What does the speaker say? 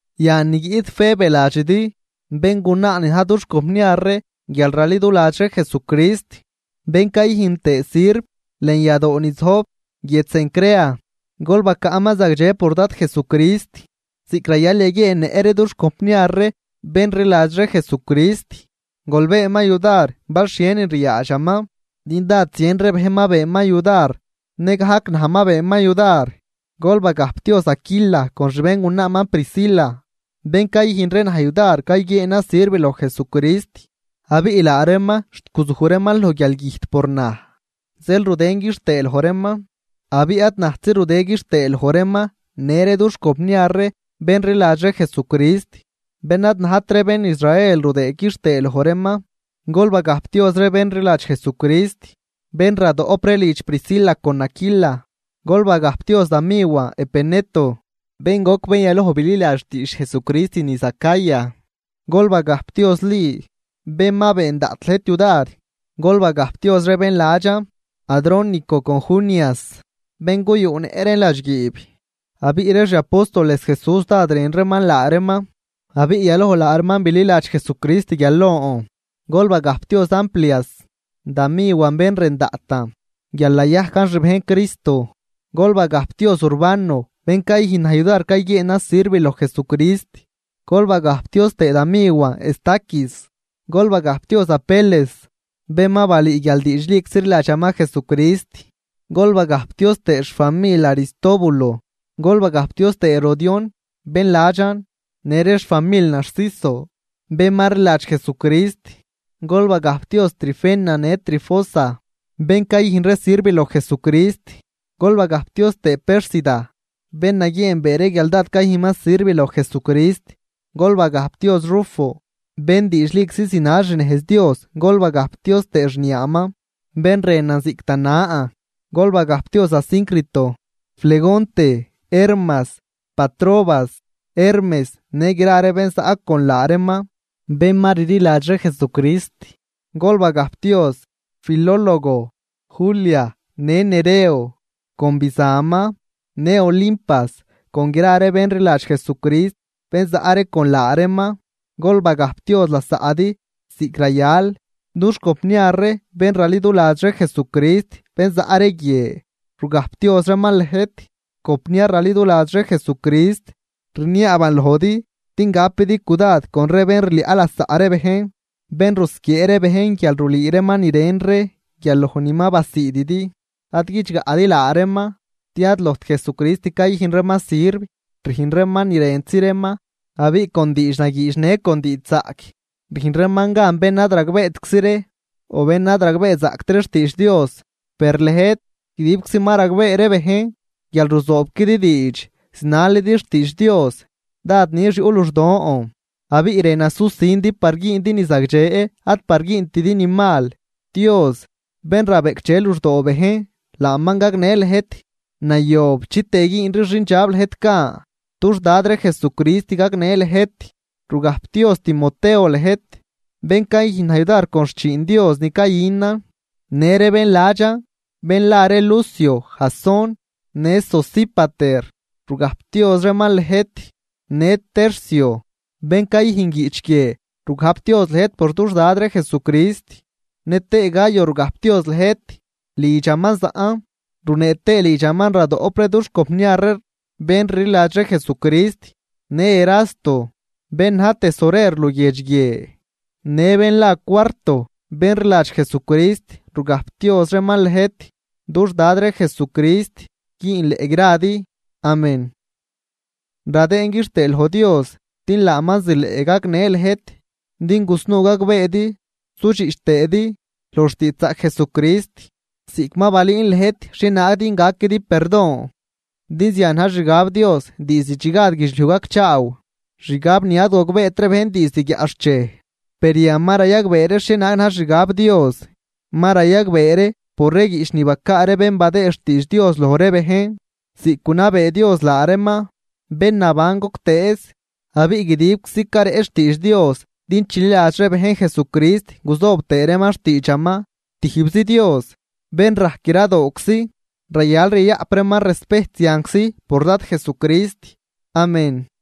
Yan ni guiꞌt Febe ladxidi, béngunaa ni na̱j dux compniar ree guial raliduladx ree Jesucrist, bén cayüjn tëë sirv lën yadoo ni zojb guiedx Cencrea. Gol bacaꞌman zagdxe por Dad Jesucrist, ziꞌc rayal yaguieennëꞌ ree dux compniar ree bén rliladx ree Jesucrist. Gol beenman yudar bal xhienin ryaadxaman, din dád zien ree bejn ma beenman yudar nëgajc naj ma beenman yudar. Gol bagajpdioz Aquila con xbéngunaaman Priscila, bén cayüjn ree naj yudar cayguieenan sirv loj Jesucrist. Abiꞌ laa reeman xt guzuj reeman loj guialgüjt por naj, zeel rudën quixtëë loj reeman. Abiꞌ ad najtzi rudë quixtëë loj reeman në ree dux compniar ree bén rliladx ree Jesucrist bén ad najt ree bén Israel rudëë quixtëë loj reeman. Gol bagajpdioz ree bén rliladx Jesucrist, bén radoꞌp ree lidx Priscila con Aquila. Gol bagajpdioz da miwan Epeneto, bén goc bén yaloj bililadx xtiidx Jesucrist niz Acaya. Gol bagajpdioz Li, bén ma been daꞌt lëjt yudar. Gol bagajpdioz ree bén ladxan Adrónico con Junias, bén guyuꞌnëꞌ reen ladxguiib. Abiꞌ ree xi apóstoles Jesús dád rën reeman laa reeman, abiꞌ yaloj laa reeman bililadx Jesucrist guial lon. Gol bagajpdioz Amplias, da miwan bén rën daꞌtan guial nayajcan xbejn Jesucrist. Gol bagajpdioz Urbano, bén cayüjn naj yudar cayguieenan sirv loj Jesucrist. Gol bagajpdioz tëë da miwan Estaquis. Gol bagajpdioz Apeles, bén ma balüü guial diidxliczi rliladxaman Jesucrist, gol bagajpdioz tëë xfamil Aristóbulo. Gol bagajpdioz tëë Herodión ben ladxan, në ree xfamil Narciso, bén ma rliladx Jesucrist. Gol bagajpdioz Trifena në Trifosa, bén cayüjn ree sirv loj Jesucrist. Gol bagajpdioz tëë Pérsida, bén naguieenbee ree guial dád cayüjnman sirv loj Jesucrist. Gol bagajpdioz Rufo, bén diidxliczi zinal xnejz Dios, gol bagajpdioz tëë xniaaman, bén rënan ziꞌc da nan. Gol bagajpdioz Asíncrito, Flegonte, Hermas, Patrobas, Hermes në gra ree bén zaꞌ con laa reeman, bén ma rliladx ree Jesucrist. Gol bagajpdioz Filólogo, Julia, në Nereo con bizanman, në Olimpas con gra ree bén rliladx Jesucrist bén zaꞌ ree con laa reeman. Gol bagajpdioz lasaꞌdi ziꞌc rayal. Dux compniar ree bén raliduladx ree Jesucrist bén zaꞌ ree guie, rugajpdioz reeman lëjt. Compniar raliduladx ree Jesucrist, rniaaban lojdi din gapidi cudad con ree bén rliaꞌ lasaꞌ ree bejn, bén rusquiee ree bejn guial rulüü reeman ni ren ree guial loj ni ma basiididi. Ad guidxgaꞌdi laa reeman, din ad lojt Jesucrist cayüjn reeman sirv, rüjn reeman ni rëntzi reeman, abiꞌ con diidxnagüüdx ne con diidxzaꞌc rüjn reeman gan bén ad ragbeetczi ree o bén ad ragbeezaꞌct ree xtiidx Dios. Per lëjt, guidibczi ma ragbee ree bejn guial ruzoobquidi diidx zinalidi xtiidx Dios, dád nix yuꞌ luxdon abiꞌ rënan susindi par güündi ni zagdxe ad par güüntidi ni mal. Dios, bén rabeꞌcdxe luxdoo bejn, laaman gagnë lëjt nayob chitëë güünri xindxab lëjt gan. Dux Dad ree Jesucrist gagnë lëjt. Rugajpdioz Timoteo lëjt, bén cayüjn naj yudar con xchiin Dios ni cayünan, në ree bén ladxan bén la ree Lucio, Jasón, në Sosípater, rugajpdioz reeman lëjt. Në Tercio, bén cayüjn guiꞌch guie rugajpdioz lëjt por dux Dad ree Jesucrist. Nëtëë Gayo rugajpdioz lëjt, lidxaman zaꞌn, runee tëë lidxaman radoꞌp ree dux compniar ree bén rliladx ree Jesucrist. Në Erasto, bén na̱j tesorer luguiedx guie në bén la Cuarto ben rliladx Jesucrist, rugajpdioz reeman lëjt. Dux Dad ree Jesucrist güünleꞌ gradi. Amén. Radëën quixtëë loj Dios din laaman zileꞌ gagnë lëjt din gusnuu gagbeedi sudxiꞌch tëëdi loj xtiidxzaꞌc Jesucrist, ziꞌc ma balüün lëjt xhienaag din gaquidi perdon. Din zian na̱j xixgab Dios diizd chi gad guidxliuj gacchaaw, xgab ni ad gogbeet ree bejn diizd guiaꞌxchej. Per yan ma rayagbee ree xhienaag na̱j xixgab Dios, ma rayagbee ree por ree guiꞌch ni bacaa ree bén badëë xtiidx Dios loj ree bejn ziꞌc gunabee Dios laa reeman, bén naban goctëëz. Abiꞌ guidibczi careꞌch xtiidx Dios din chililadx ree bejn Jesucrist guzoob tëë reeman xtiidxaman. ¡Tijbzi Dios, bén rajc gradooczi, rayal yayaꞌp reeman respejt zianczi por Dad Jesucrist! Amén.